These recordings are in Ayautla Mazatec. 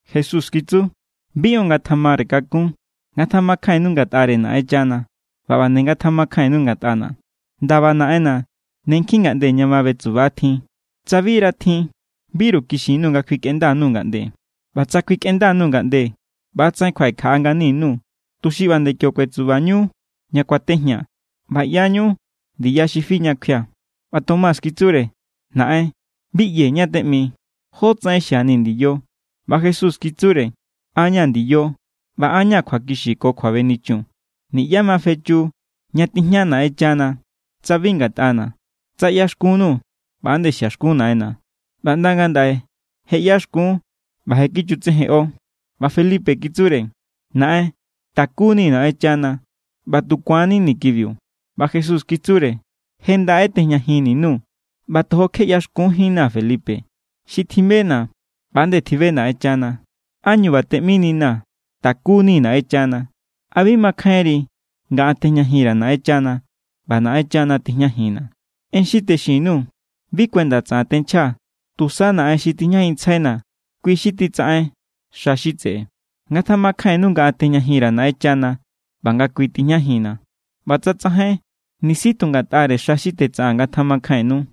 Jesús kitsu: —Bi on ngatjamare kakún. Ngatjamakjainnu ngatꞌare Naꞌenchana ꞌba ꞌba nde ngatjamakjainnu ngatꞌana̱. Ndaba Naꞌenna̱ ne nkjin ngaꞌnde ña ma betsuba tjin. Tsa bira tjin, biru kixin_nuu̱ nga kjuikꞌenda_nuu̱ ngaꞌnde. ꞌBa tsa kjuikꞌenda_nuu̱ ngaꞌnde, ꞌba=tsaꞌen kjuaꞌekjaꞌa ngani_nuu̱, tuxi ꞌba nde kio kuetsubañu ña kuatejñaa̱. ꞌBa ꞌyañu ndiya xi fi ña kjuia̱. ꞌBa Tomás kitsure: —Naꞌen, bi ꞌyee̱ ñá= teꞌmi. ¿Jótsaꞌen xiani̱ ndiyo? ꞌBa Jesús kitsure: —An= ña̱ ndiyo ꞌba an= ña̱ kjuakixiu ko kjuabenichun. Niꞌyá ma fechu ña tijña Naꞌenchana tsa bi ngatꞌana̱. Tsa ꞌyaxkunnuu̱, ꞌba=nde xiaxkun Naꞌenna̱. ꞌBa ꞌnda ngandaꞌe je ꞌyaxkun, ꞌba je kichutsejenꞌo. ꞌBa Felipe kitsure: —Naꞌen, takunii̱ Naꞌenchana ꞌba tu ku̱annini̱ kibiu. ꞌBa Jesús kitsure: —Je ndaꞌe tejñajin_nuu̱ ꞌba tojo kje ꞌyaxkunjínnaa̱, Felipe. Xi tjibena̱, ꞌba=nde tjibe Naꞌenchana. ¿Ánñu ꞌba teꞌmininaa̱: “Takunii̱ Naꞌenchana”? ¿A bi makjainri nga an tejñajin_ra̱ Naꞌenchana ꞌba Naꞌenchana tijñajinna̱? En xi texin_nuu̱ bi kuenda tsaꞌan tenchjaa̱. Tusa Naꞌen xi tijñajinntsjaina̱, kui= xi titsaꞌen xa xi tseꞌe. Ngatjamakjainnu nga an tejñajin_ra̱ Naꞌenchana ꞌba nga kui tijñajinna̱. ꞌBa tsa tsajain, nisi tu ngatꞌare xa xi tetsaꞌaa̱n ngatjamakjainnu.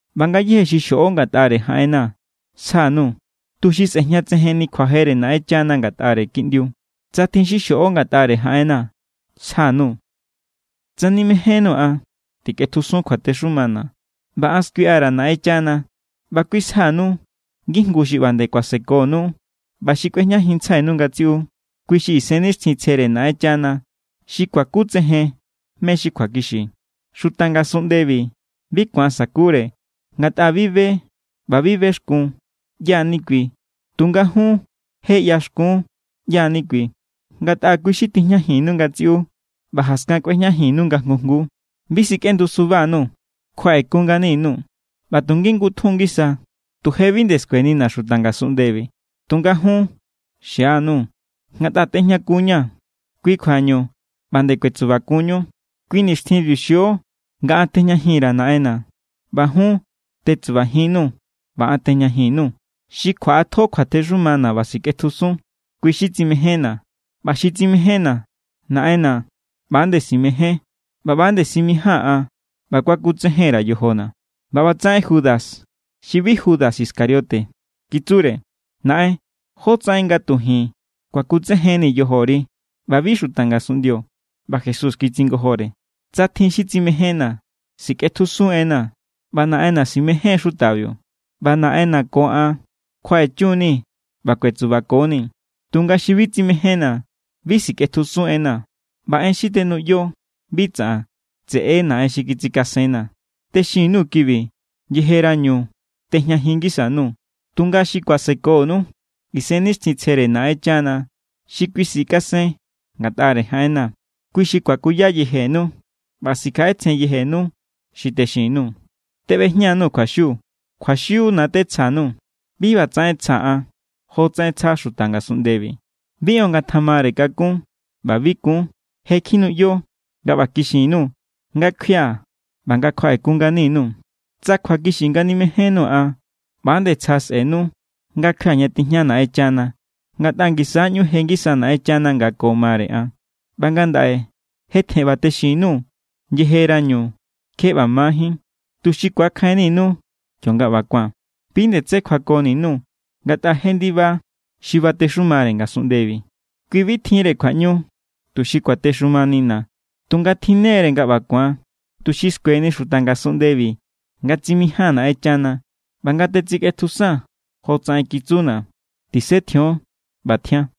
ꞌBa ngayéje xi xjoꞌo ngatꞌare jaꞌenna̱ sja_nuu̱, tuxi sꞌe̱jñatsejenni kjuajere Naꞌenchana ngatꞌare Kiꞌndiu. Tsa tjin xi xjoꞌo ngatꞌare jaꞌenna̱, sja_nuu̱. ’Tsa nimejénnuu̱ an, tikꞌetjusun kjuatexumana̱. ꞌBa an skuiꞌa_ra̱ Naꞌenchana, ꞌba kui sjanu ngijngu xi ꞌba nde kuasekonu ꞌba xi kꞌuejñajinntsjainu ngatsiꞌu. Kui= xi Isennixtjintsjere Naꞌenchana xi kuakutsejen mé= xi kjuakixi. Xuta ngasunꞌndebi bi ku̱an sakure, ngatꞌa bi be ꞌba bi bexkun ꞌyá= ni kui. Tunga jun, je ꞌyaxkun ꞌyá= ni kui, ngatꞌa kui= xi tijñajinnu ngatsiꞌu ꞌba jaskan kꞌuejñajinnu nga jngu jngu. ’Bi sikꞌendu suba_nuu̱, kjuaꞌekun ngani_nuu̱. ꞌBa tu ngingutjun= ngisa tu je bi nde skuenina̱ xuta ngasunꞌndebi, tunga jun xianuu̱. Ngatꞌa tejñakunña̱, kui kjuañu ꞌba nde kuetsubakunñu. Kui nixtjinbiu xio nga an tejñajin_ra̱ Naꞌenna̱ ꞌba jun tetsubajinnuu̱ ꞌba an tejñajin_nuu̱. Xi kjuaꞌatjo kjuatexumana̱ ꞌba sikꞌetjusun, kui= xi tsimejénna̱. ꞌBa xi tsimejénna̱, Naꞌenna̱ ꞌba=nde simején ꞌba ꞌba=nde simijía̱n an ꞌba kuakutsejen_ra̱ yojona̱. ꞌBa ꞌbatsaꞌen Judas (xi bi Judas Iscariote) kitsure: —Naꞌen, ¿jótsaꞌen nga tu ji̱n kuakutsejennii̱ yojori ꞌba bi xuta ngasunꞌndio? ꞌBa Jesús kitsingojore: —Tsa tjin xi tsimejénna̱, sikꞌetjusun= enna̱. ꞌBa Naꞌenna̱ si̱mején= xutabiu, ꞌba Naꞌenna̱ ko an kjuaꞌechun=ni̱ ꞌba kuetsubako=ni̱. Tunga xi bi tsimejénna̱, bi sikꞌetjusun enna̱. ꞌBa en xi tenuꞌyo, bi tsaꞌan. Tseꞌe= Naꞌen xi kitsikasenna̱. ’Texin_nuu̱ kibi yejerañu tejñajin ngisa_nuu̱. Tunga xi kuasekonu, Isennixtjintsjere Naꞌenchana xi kui sikasen ngatꞌare jaꞌenna̱, kui xi kuakuya yejenu ꞌba sikjaꞌetsjen yejenu xi texin_nuu̱. ’Teꞌbejña_nuu̱ kjuaxiu. Kjuaxiuna̱ tetsja_nuu̱. Bi ꞌbatsaꞌen tsjaa̱ an jotsaꞌen tsja xuta ngasunꞌndebi. Bi on ngatjamare kakún ꞌba bi kun. Je kjinuꞌyo nga ꞌba kixin_nuu̱ nga kjuia̱ ꞌba nga kjuaꞌekun ngani_nuu̱. Tsa kjuakixi nga nimejénnuu̱ an, ꞌba=nde tsja sꞌe̱nu nga kjuia̱ ña tijña Naꞌenchana, ngatꞌa ngisa= ꞌñu je ngisa Naꞌenchana nga ko mare an. ꞌBa ngandaꞌe je tjen ꞌba texin_nuu̱ yejerañu kje ꞌba majín, tuxi ku̱akjainninu kionga ꞌba ku̱an. ’Bi nde tsé kjuakoni_nuu̱, ngatꞌa je ndiba xi batexumare ngasunꞌndebi. Kui bi tjinre kjuaꞌñu tuxi kuatexumanina̱, tunga tjinne=re nga ꞌba ku̱an, tuxi skueni xuta ngasunꞌndebi nga tsimijía̱n Naꞌenchana ꞌba nga tetsikꞌetjusaa̱n jotsaꞌen kitsuna̱. Tisetjion ꞌba tjian.